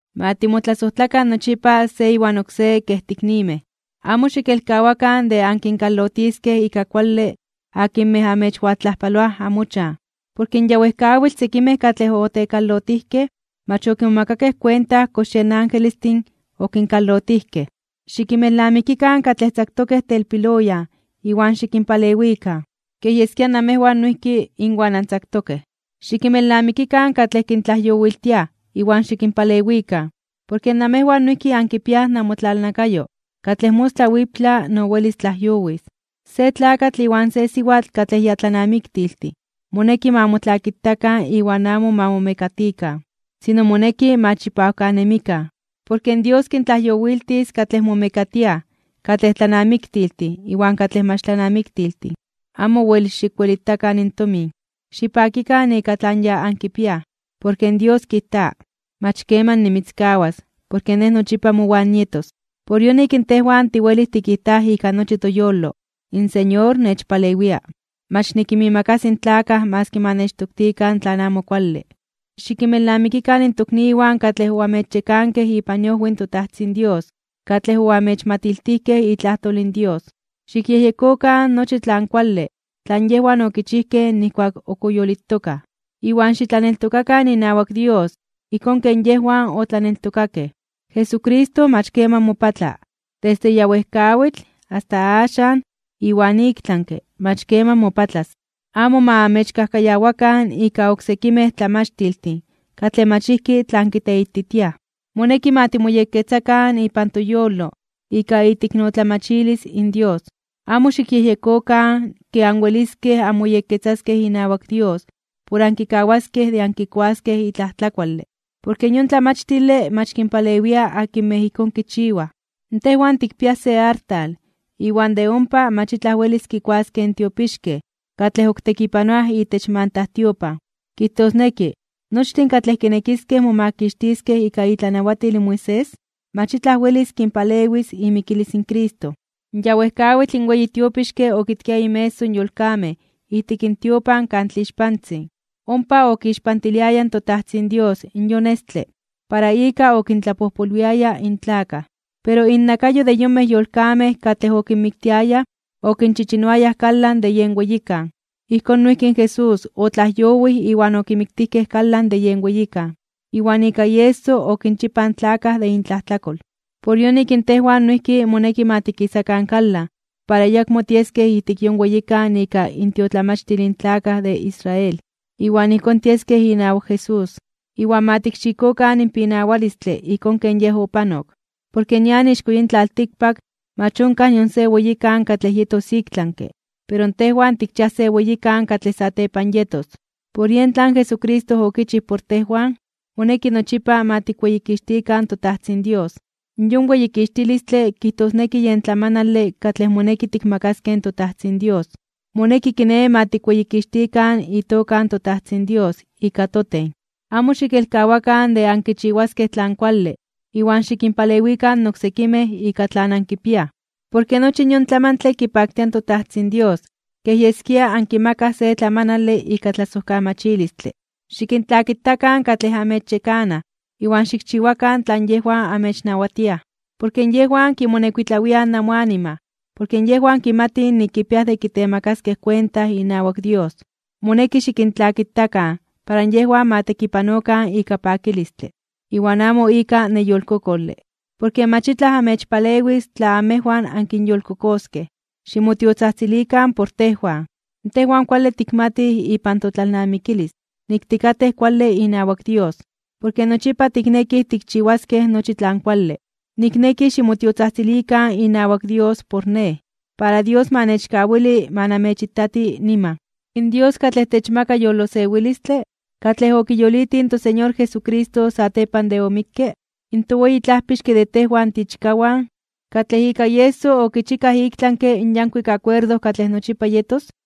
Ma timotlasojtlakan nochipa se iwan oksé kej tiiknimej. Amo xikelkawakan de ankinkalotiskej ika kuale akinmej amechwaltlajpaloaj amochan. Porke ya wejkawitl sekimej katlej otekalotijkej mach okimomakakej kuenta kox yen angelestin okinkalotijkej. Xikinmelnamikikan katlej tzaktokej telpiloyan iwan xikinpalewikan, kej yeskia namejwan noijki inwan antzaktokej. Xikinmelnamikikan katlej kintlajyowiltiaj iwan xikinpalewikan, porke namejwan noijki ankipiaj namotlalnakayo katlej mostla wiptla no welis tlajyowis. Se tlakatl iwan se siwatl katlej ya tlanamiktiltin moneki ma motlakitakan iwan amo ma momekatikan, sino moneki ma chipawkanemikan. Porke Dios kintlajyowiltis katlej momekatiaj katlej tlanamiktiltin iwan katlej mach tlanamiktiltin. Amo wel xikwelitakan in tomin. Xipakikan ika tlan ya ankipiaj, porke Dios kijta: “Mach keman nimitzkawas, porke Nej nochipa mowan nietos.” Por yonik in tejwan tiwelij tikijtaj ika nochi toyolo: In Señor nechpalewia. Mach nikinmiimakasi in tlakaj maski ma nechtoktikan tlan amo kuale. Xikinmelnamikikan in tokniwan katlej oamechyekankej ipan iojwi in toTajtzin Dios, katlej oamechmatiltijkej itlajtol in Dios. Xikyejyekokan nochi tlan kuale tlan yejwan okichijkej nijkuak ok oyolitokaj, iwan xitlaneltokakan inawak Dios ijkón ken yejwan otlaneltokakej. Jesucristo mach keman mopatla. Desde ya wejkawitl, asta axan, iwan iktlanke (ik tlami) mach keman mopatlas. Amo ma amechkajkayawakan ika oksekimej tlamachtiltin katlej mach ijki tlan kiteititiaj. Moneki ma timoyekketzakan ipan toyolo ika iteiknotlamachilis in Dios. Amo xikyejyekokan ke anweliskej anmoyekketzaskej inawak Dios por ankikawaskej de ankikuaskej itlaj tlakuale. Porke yon tlamachtile mach kinpalewia akinmej ijkón kichiwaj. Tejwan tikpiaj se artal iwan de ompa mach itlaj welis kikuaskej in tiopixkej katlej ok tekipanoaj itech mantajtiopan. Kijtosneki, nochtin katlej kinekiskej momakixtiskej ika itlanawatil in Moisés, mach itlaj welis kinpalewis imikilis in Cristo. Ya wejkawitl in weyi tiopixke okitkia inmeso yolkamej ijtik tiopan Kan Tlixpantzin. Ompa okixpantiliaya in toTajtzin Dios yon estle para ika okintlapojpolwiaya in tlakaj, pero innakayo de yonmej yolkamej katlej okinmiktiayaj okinchichinoayaj kalan de yen weyikan. Ijkón noijki in Jesús otlajyowij iwan okimiktijkej kalan de yen weyikan, iwan ika ieso okinchipaj in tlakaj de intlajtlakol. Por yonik tejwan noijki moneki ma tikisakan kalan para ayakmo tieskej ijtik yon weyikan ika intiotlamachtil in tlakaj de Israel. Iwan ijkón tieskej inawak Jesús. Iwan ma tikxikokan in pinawalistle ijkón ken Yej opanok. Porke nian ixko yin tlaltikpak mach onkaj nion se weyikan katlej yetos iktlanke (ik tlami). Pero tejwan tikchiaj se weyikan katlej satepan yetos. Por yen tlan Jesucristo okichij por tejwan, moneki nochipa ma tikweyikixtikan toTajtzin Dios. Yon weyikixtilistle kijtosneki yen tlamanale katlej moneki tikmakaskej in toTajtzin Dios. Moneki kiné ma tikweyikixtikan itoka in toTajtzin Dios ika toten. Amo xikelkawakan de ankichiwaskej tlan kuale iwan xikinpalewikan oksekimej ika tlan ankipiaj. Porke nochi yon tlamantle kipaktia in toTajtzin Dios kej yeskia ankimakaj se tlamanale ika tlasojkamachilistle. Xikintlakitakan katlej amechyekanaj iwan xikchiwakan tlan yejwan amechnawatiaj. Porke yejwan kimonekuitlawiaj namoanima porke yejwan kimatij nik kipiaj de kitemakaskej kuenta inawak Dios. Moneki xikintlakitakan para yejwan ma tekipanokan ika pakilistle, iwan amo ika neyolkokole. Porke mach itlaj amechpalewis tla amejwan ankinyolkokoskej. Ximotiotzajtzilikan por tejwan. Tejwan kuale tikmatij ipan totlalnamikilis nik tikatej kuale inawak Dios, porke nochipa tiknekij tikchiwaskej nochi tlan kuale. Nikneki ximotiotzajtzilikan inawak Dios por nej, para Dios ma nechkawili ma namechitati niman. In Dios katlej techmaka yolosewilistle, katlej okiyolitij in toSeñor Jesucristo satepan de omikke, in toweyi Tlajpixke de tejwan tiichkawan, katlej ika ieso okichikaj iktlanke (ik tlami) in yankuik akuerdo katlej nochipa yetos,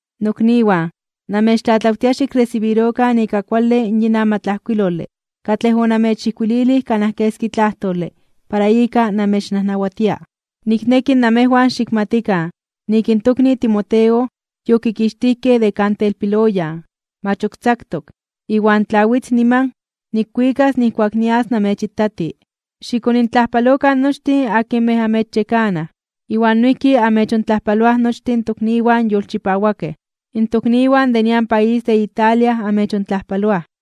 Nokniwan, namechtlatlawtia xikresibirokan ika kuale yin amatlajkuilole katlej onamechijkuililij kanaj keski tlajtole para ika namechnajnawatia. Nikneki namejwan xikmatikan nik in tokni Timoteo yokikixtijkej de kan telpiloyan, mach ok tzaktok. Iwan tla witz niman, nikwikas nijkuak nias namechitati. Xikonintlajpalokan nochtin akinmej amechyekanaj, iwan noijki amechontlajpaloaj nochtin tokniwan yolchipawakej. In tokniwan de nian país de Italia amechontlajpaloaj.